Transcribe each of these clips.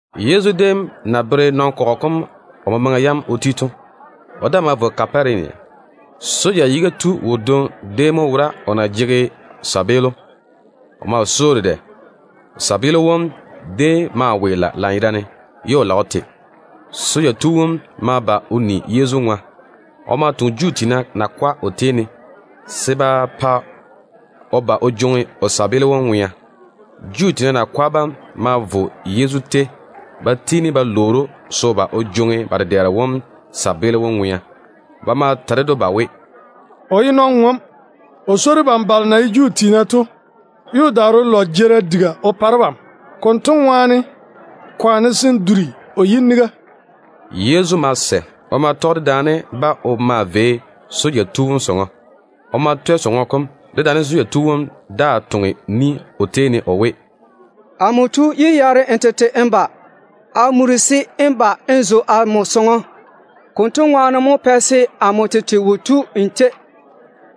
Yezu déem na bere nɔn-kɔgɔ kom o memaŋa yam o ti to, o daa ma vo Kaparenia. Rom tiina soja yiga tu wodwoŋi déem mo wora, o na jege sɔŋɔ tontoŋeno. O maa swoi‑o dedɛ. O tontoŋeno wom déem maa weela lanyerane ye o lage o te. Soja tu wom ma ba o ni Yezu ŋwa. O ma toŋe Juu tiina nakwa o tei ne se ba pa o ba o jwoŋi o tontoŋeno wom ŋwea. Juu tiina nakwa bam ma vo Yezu tei ba tiini ba lwoori‑o se o ba o jwoŋi ba dedɛɛro wom tontoŋeno wom ŋwea. Ba ma ta ded‑o ba we, “O ye nɔn-ŋom. O swoi debam Juu tiina dwi dem, ye o daare o lɔ jeerim diga o pa debam. Konto ŋwaane, kwaane se n duri o yiniga.” Yezu ma sɛ. O ma tɔge dedaane-ba o maa vei soja tu wom sɔŋɔ. O ma twɛ sɔŋɔ kom, dedaane soja tu wom daa toŋe ni o tei ne o we, “Amo tu, yé yaare n tete n ba. A muri se n ba n zo amo sɔŋɔ. Konto ŋwaane mo pɛ se amo tete wo tu nmo tei.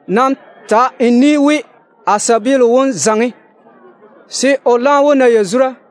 Nam ta n ni we, a tontoŋeno wom zaŋe, se o laam wó na yazura.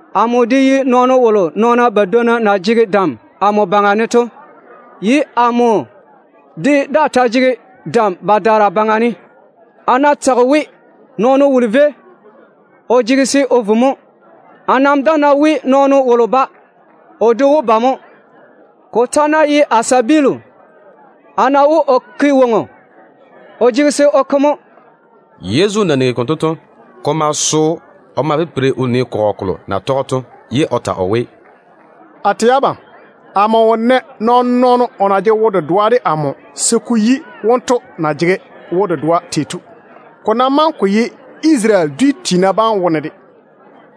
Amo de ye nɔɔno wolo nɔɔna badwonna na jege dam amo baŋa ne to, ye amo de daa ta jege dam badaara baŋa ne. A ná tage we nɔɔno wolo véi, o jege se o vo mo. A nam daa ná we nɔɔno wolo ba, o de wó ba mo. Ko ta ná ye a tontoŋeno, a ná we o ke woŋo, o jege se o ke mo.” Yezu na nigi konto to, ko ma so‑o. O ma pipiri o nii kɔgɔ kolo na tɔge‑o to, ye o ta o we, “A tɛ abam, amo wo nɛ nɔɔn-nɔɔno o na jege wo-dedoa de amo se ko yi wonto na jege wo-dedoa tei to, ko ná maŋe ko ye Isarele dwi tiina bam wone de.”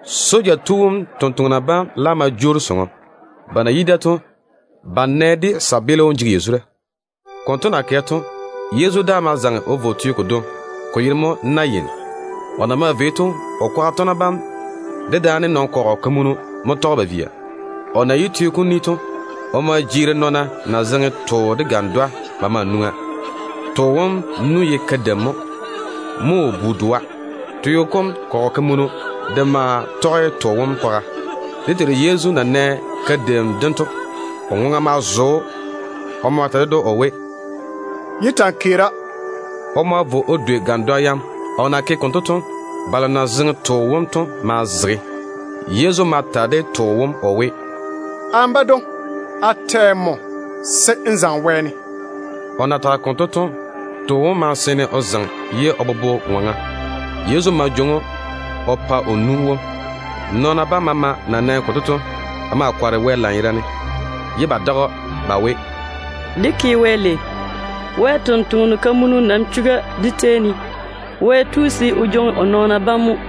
Soja tu wom nɔɔna bam laam ma jwoori sɔŋɔ. Ba na yi da to, ba nɛ de tontoŋeno wom jege yazura. Konto na kɛ to, Yezu daa ma zaŋe o vo teo kodwoŋi, ko yere mo Nayin. O na maa vei to, o kwaga tɔgena bam dedaane nɔn-kɔgɔ kamunu mo tɔge‑o ba maa via. O na yi teo kom ni to, o ma jeeri nɔɔna na zeŋe too de gandwa ba maa nwoŋa. Too wom nu ye kadeim mo. Mo o bu-doa. Teo kom kɔgɔ kamunu de maa tɔge too wom kwaga. Dé Teiru Yezu na nɛ kadeim dem to, o ma duri o ŋwaŋa. O ma ta ded‑o o we, “Yé ta‑n keera.” O ma vo o dwei gandwa yam. O na ke konto to, balo na zeŋe too wom to ma zege. Yezu ma ta de too wom o we, “Amo badwoŋi, a tɛ nmo se n zaŋe wɛɛne!” O na tage konto to, too wom ma seene o zaŋe ye o bobo ŋɔŋa. Yezu ma jwoŋi‑o o pa o nu wom. Nɔɔna bam maama na nɛ konto to, ba ma kɔre Wɛ lanyerane, ye ba tei‑o ba we, “Dé ke Wɛ lei! Wɛ ni-jwoŋinu kamunu nam chuga dé tei ne. Wɛ tu se o jwoŋi o nɔɔna bam mo.”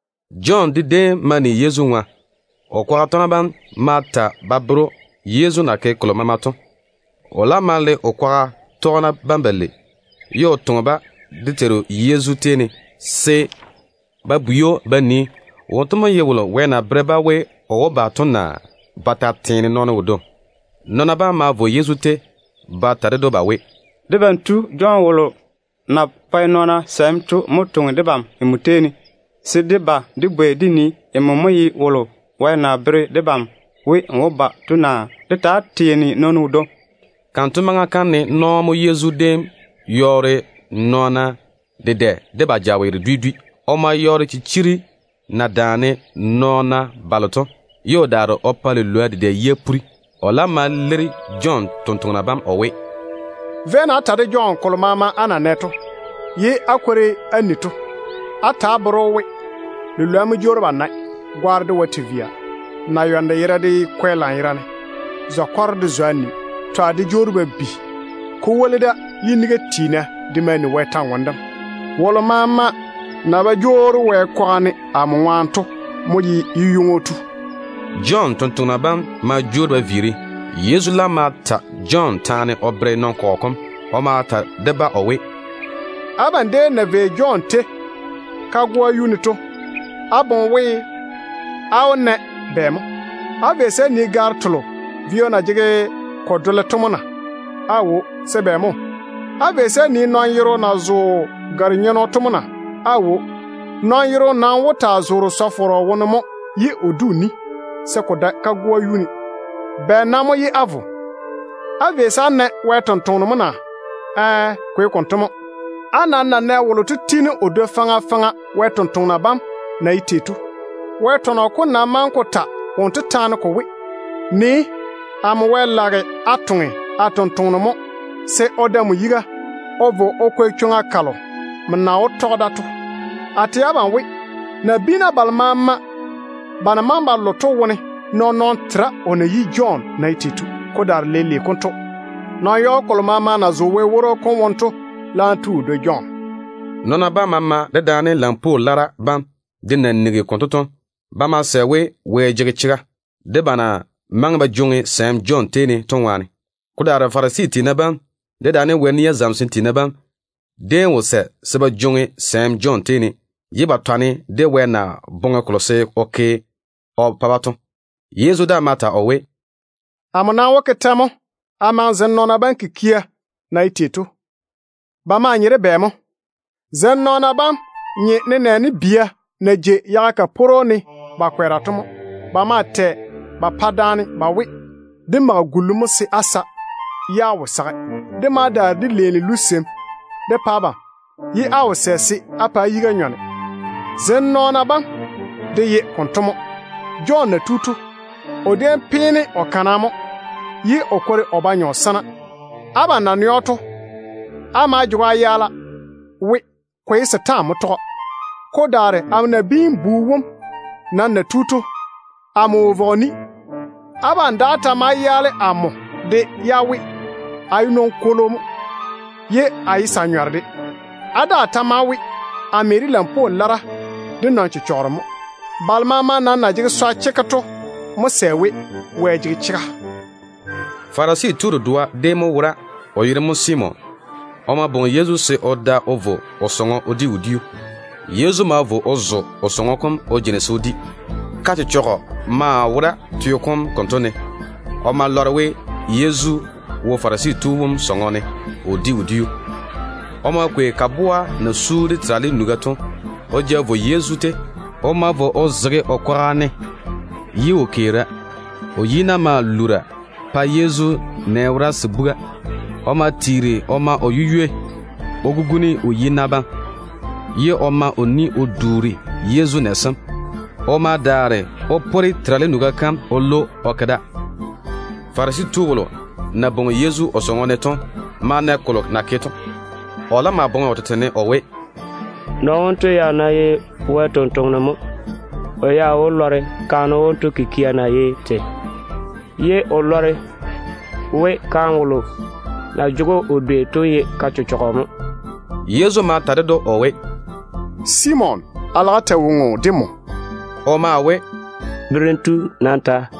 Jɔn de déem ma ni Yezu ŋwa. O kwaga tɔgena bam ma ta ba bere‑o Yezu na ke kolo maama to. O laam ma le o kwaga tɔgena bam balei, ye o toŋe-ba dé Teiru Yezu tei ne, se ba bwei‑o ba nii, wonto mo ye wolo Wɛ na bere-ba we o wó ba to, naa ba ta teene nɔɔno wodwoŋi. Nɔɔna bam ma vo Yezu tei ba ta ded‑o ba we, “Debam tu Jɔn wolo na pae nɔɔna sɛɛm to mo toŋe debam nmo tei ne, se dé ba dé bwei dé nii, nmo mo ye wolo Wɛ na bere debam we n wó ba to, naa de ta teene nɔɔno wodwoŋi?” Kanto maŋa kam ne nɔɔ mo Yezu déem yɔɔre nɔɔna dedɛ de ba jaweero dwi dwi. O ma yɔɔre chichiri na daane nɔɔna balo to, ye o daare o pa lilwoa dedɛ yia puri. O laam ma leiri Jɔn tontoŋena bam o we, “Véi-na á ta de Jɔn kolo maama á na nɛ to, ye á kwori á ni to. Á ta á bere‑o we, lilwoa mo jwoori ba nae, gwaaro de wae te via, naywanno yera de kwɛ lanyerane, zɔ-kɔro de zwa ni, twa de jwoori ba bi. Ko woli da, yiniga tiina de maa ni Wɛ kwor-ywoŋa kam. Wolo maama na ba jwoori Wɛ kwaga ne amo ŋwaane to mo ye yu-ywoŋo tu.” Jɔn tontoŋena bam ma jwoori ba viiri. Yezu laam ma ta Jɔn taane o bere nɔn-kɔgɔ kom. O ma ta de-ba o we, “Abam déem na vei Jɔn tei kagoa yuu ne to, á boŋe we á wó na bɛ mo? Á vei se á nii gaaro telo vio na jege ko dole to mo na? Aawo. Se bɛ mo? Á vei se á nii nɔn-yero na zo gare-nyenno to mo na? Aawo. Nɔn-yero nam wó taa zoore sɔ-fɔrɔ wone mo ye o di o ni, se ko dae kagoa yuu ne. Bɛ nam mo ye á vo? Á vei se á na Wɛ sampwora mo na? Ɛɛ, ko ye konto mo. Á nam na nɛ wolo to tiini o dwoi faŋa faŋa Wɛ sampwori sem na ye tei to. Wɛ tɔnɔ kom nam maŋe ko ta wonto taane ko we: ‘Nii, amo Wɛ lage a toŋe a tontoŋeno mo, se o da nmo yiga o vo o kwɛ chwoŋa kalo nmo na wó tɔge da to.’ A tɛ abam we, nabiina balo maama ba na maŋe ba lo to wone nɔɔn-nɔɔno tera o na yi Jɔn na ye tei to. Ko daare leile konto, nɔn-yɔɔ kolo maama na zo Wɛ paare woro kom wone to laam tu o dwoi Jɔn.” Nɔɔna bam maama dedaane lampwoo lara bam de na nigi konto to, ba ma sɛ we Wɛ jege chega, ba na maŋe ba jwoŋi sɛɛm Jɔn tei ne to ŋwaane. Ko daare Farisi tiina bam dedaane Wɛ nia zamesem tiina bam déem wo sɛ se ba jwoŋi sɛɛm Jɔn tei ne, ye ba yɔɔre ba ve se ba jwoŋi Wɛ na boŋe se o ke kolo o pa-ba to. Yezu daa ma ta o we, “Amo nam wó ke tɛ mo a maŋe zem nɔɔna bam kikia na ye tei to? Ba maa nye de bɛ mo? Zem nɔɔna bam nye nenɛɛne bia na jei yaga kaporo ne ba kwɛɛra to mo. Ba maa tɛ ba pa daane ba we: ‘Dé mage gullu mo se á sa, ye á wo sage. Dé ma daare dé leeni luseim dé pa abam, ye á wo sɛ se á pa á yiga nyɔne.’ Zem nɔɔna bam de ye konto mo. Wɛ sɛɛm tu Jɔn na tu to, o déem peene o kana mo, ye o kwori o ba nyɔ sana. Abam na nɛ‑o to, á maa jege‑o á yaala we, ko ye setaane mo tɔge‑o. Ko daare amo Nabiin-bu wom nam na tu to, amo wo vɔge ni. Abam daa ta maa yaale amo de, ye á we a ye nɔn-kwolo mo, ye a ye sa-nyɔro de. Á daa ta maa we, a me de lampwoo lara de nɔn-chechɔgero mo. Balo maama nam na jege yi-poro chekke to mo sɛ we Wɛ jege chega.” Farisi tu dedoa déem mo wora, o yere mo Simon. O ma bwoŋi Yezu se o da o vo o sɔŋɔ o di wodiu. Yezu ma vo o zo o sɔŋɔ kom o jeini se o di. Ka-chechɔgɔ maa wora teo kom konto ne. O ma lɔre we Yezu wo Farisi tu wom sɔŋɔ ne o di wodiu. O ma kwei kaboa na su de terale nuga to o ja vo Yezu tei. O ma vo o zege o kwaga ne, ye o keera. O yi-na maa lura pae Yezu nɛ wora se buga. O ma tiiri o ma o yu-ywei o guguni o yi-na bam, ye o ma o ni o duuri Yezu nɛ sem. O ma daare o pore terale nuga kam o lwo o ke da. Farisi tu wolo na bwoŋi Yezu o sɔŋɔ ne to ma na kolo na ke to. O laam ma boŋe o tete ne o we, “Nɔɔno wonto ya ná ye Wɛ ni-jwoŋinu chekke mo, o ya wó lɔre kaane wonto kikia na ye tei, ye o lɔre we kaane wolo na jege‑o o dwei to ye ka-chechɔgɔ mo.” Yezu ma ta ded‑o o we, “Simon, a lage a ta woŋo de nmo.” O maa we, “Berem tu, nam ta.”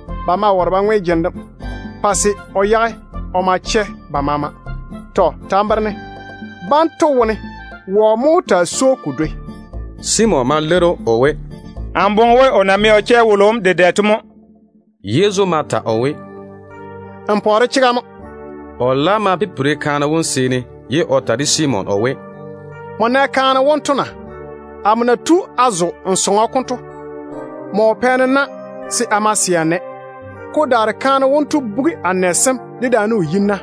Ba ma ware ba ŋwe jene dem, pa se o yage o ma chɛ ba maama. Tɔ. Ta n bere-ne, banto wone wɔ mo wó taa swoi‑o ko dwoi?” Simon ma leiri‑o o we, “Amo boŋe we o na mɛ o chɛ wolo wom dedɛ to mo.” Yezu ma ta o we, “N pɔɔre chega mo.” O laam ma pipiri kaane wom seeni, ye o ta de Simon o we, “Nmo nɛ kaane wonto na? Amo na tu a zo n sɔŋɔ kom to, nmo wo pɛ-ne na se a ma se a nɛ. Ko daare kaane wonto bugi a nɛ sem dedaane o yi-na,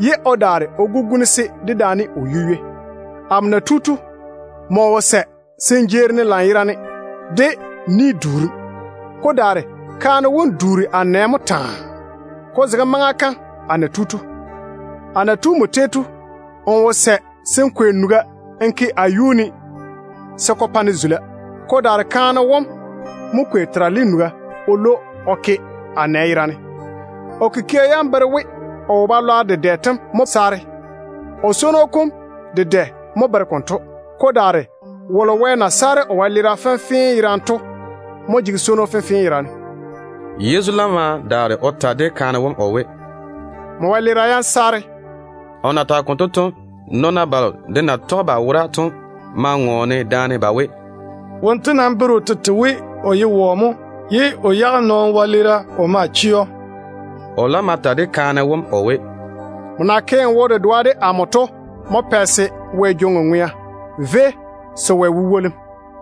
ye o daare o guguni-se dedaane o yu-ywei. Amo na tu to, nmo wo kukwori-ne se ko bere we n jeeri-ne lanyerane. Ko daare kaane wom duuri a nɛ mo taa, ko zege maŋa kam a na tu to. A na tu nmo tei to, n wo sɛ se n kwei nuga n ke a yuu ne se ko pa-ne zula. Ko daare kaane wom mo kwei terale nuga o lwo o ke a nɛ yera ne. O kikia yam bere we o wo-balwaaro dedɛ tem mo saare. O swono kom dedɛ mo bere konto. Ko daare wolo Wɛ na saare o wɛleera fenfee yerane to mo jege swono fenfee yerane.” Yezu laam ma daare o ta de kaane wom o we, “Nmo wɛleera yam saare.” O na tage konto to, nɔɔna balo de na tɔge ba wora to ma ŋɔɔne daane ba we, “Wonto nam bere o tete we o ye wɔ mo ye o yage nɔɔno wɛleera o ma chɛ‑o?” O laam ma ta de kaane wom o we, “Nmo na ke n wo-dedoa de amo to mo pɛ se Wɛ jwoŋi n ŋwea. Véi, se Wɛ wó pa‑m yazura.”